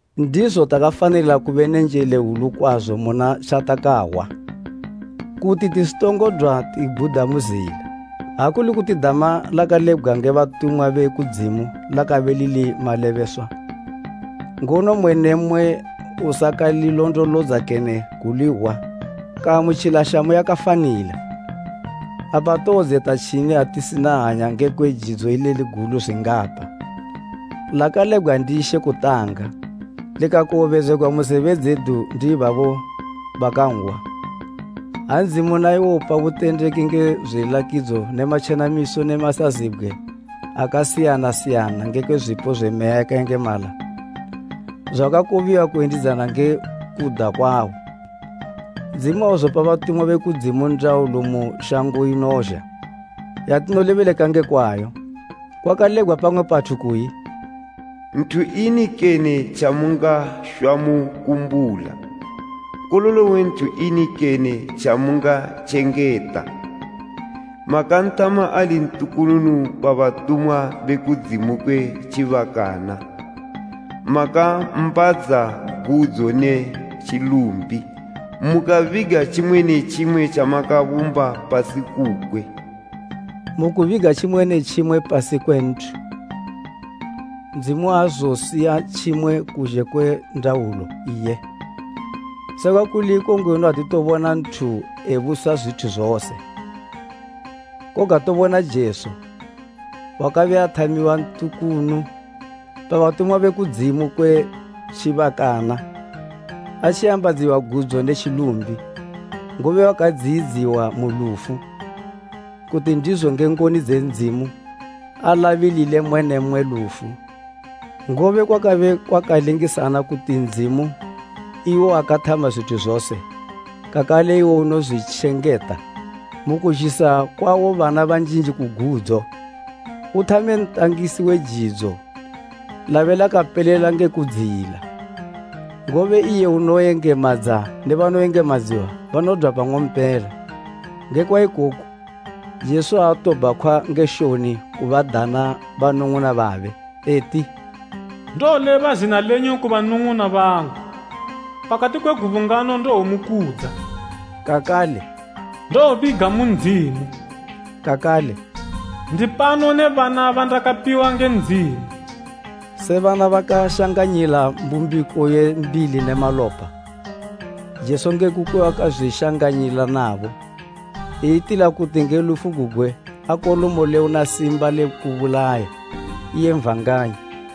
Ndizo takafanila kube ne njele hwulu kwazo muna tjatakahwa, kuti tisitongodwa tibhuda mu zila. Ha kuli kuti dama lakalebgwa nge batumwa be kudzimu lakabe lili malebeswa, ngono mmwe ne mmwe usakalilondolodza kene kulihwa kaamutjila shamu yakafanila, apa towodzeta tjini ha tisina hanya ngekwe jidzo ileli gulu zwingapa? Lakalebgwa ndi She kutanga, likakowobedzegwa mu zebe dzedu ndi ibabo bakanhwa, ha Ndzimu naiwo upa butendeki nge zwilakidzo ne matjenamiso ne masazibgwe akasiyana siyana nenge zwipo zwe Meya yakayengemala, zwakakobiwa kuyendidzana nge kuda kwawo. Ndzimu auzopa batumwa be kudzimu ndaulo mu shango inozha, yatinolebeleka nge kwayo. Kwakalebgwa pamwe pathu kuyi, “Nthu ini kene tjamungashwa mukumbula, nkololo we nthu ini kene tjamungatjengeta? Makanthama ali ntukunu pa batumwa be kudzimu kwe tjibakana, makammbadza gudzo ne tjilumbi, mukabiga tjimwe ne tjimwe tjamakabumba pasi kukwe.” Mukubiga tjimwe ne tjimwe pasi kwe nthu, Ndzimu auzosiya tjimwe kuzhe kwe ndaulo iye. Sekwa kuli iko ngwenu atitobona nthu ebusa zwithu zose. Koga tobona Jesu, wakabe athamiwa ntukunu pa batumwa be kudzimu kwe tjibakana atjimbadziwa, gudzo ne tjilumbi, ngobe wakadziyidziwa mu lufu, kuti ndizo nge ngoni dze Ndzimu alabilile mmwe ne mmwe lufu. Ngobe kwakabe kwakalingisana kuti Ndzimu iwo wakathama zwithu zose, kakale iwo unozwitjengeta, mukuzhisa kwawo bana banjinji ku gudzo, uthame ntangisi we jidzo lakapelela ngo kudziyila. Ngobe iye unoyengemadza ne banoyengemadziwa banodwa pang'ompela. Ngekwa ikoku, Jesu aatobhakhwa nge shoni kubadana banung'una babe, eti, “Ndowoleba zina lenyu ku banung'una bangu, pakati kwe gubungano ndowomukudza.” Kakale, “Ndowobiga mu Ndzimu.” Kakale, “Ndipano ne bana bandakapiwa nge Ndzimu.” Se bana bakashanganyila mbumbiko ye mbili ne malopa, Jesu nge kukwe wakazwishanganyila nabo. Eyitila kuti nge lufu gugwe akolomole una simba le kubulaya, iye Satani,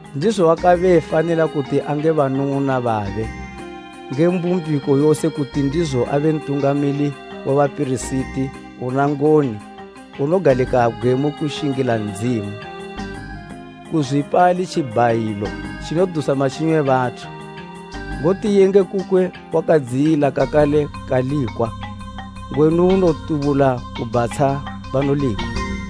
Ndizo wakabe efanila kuti ange banung'una babe nge mbumbiko yose kuti ndizo abe Ntungamili we bapirisiti una ngoni unogalikabgwe mu kushingila Ndzimu, kuzwipa ali tjibhayilo tjinodusa matjinyo e bathu. Ngoti iye nge kukwe wakadziyila kakale kalikwa, ngwenu unotubula kubhatsha banolikwa.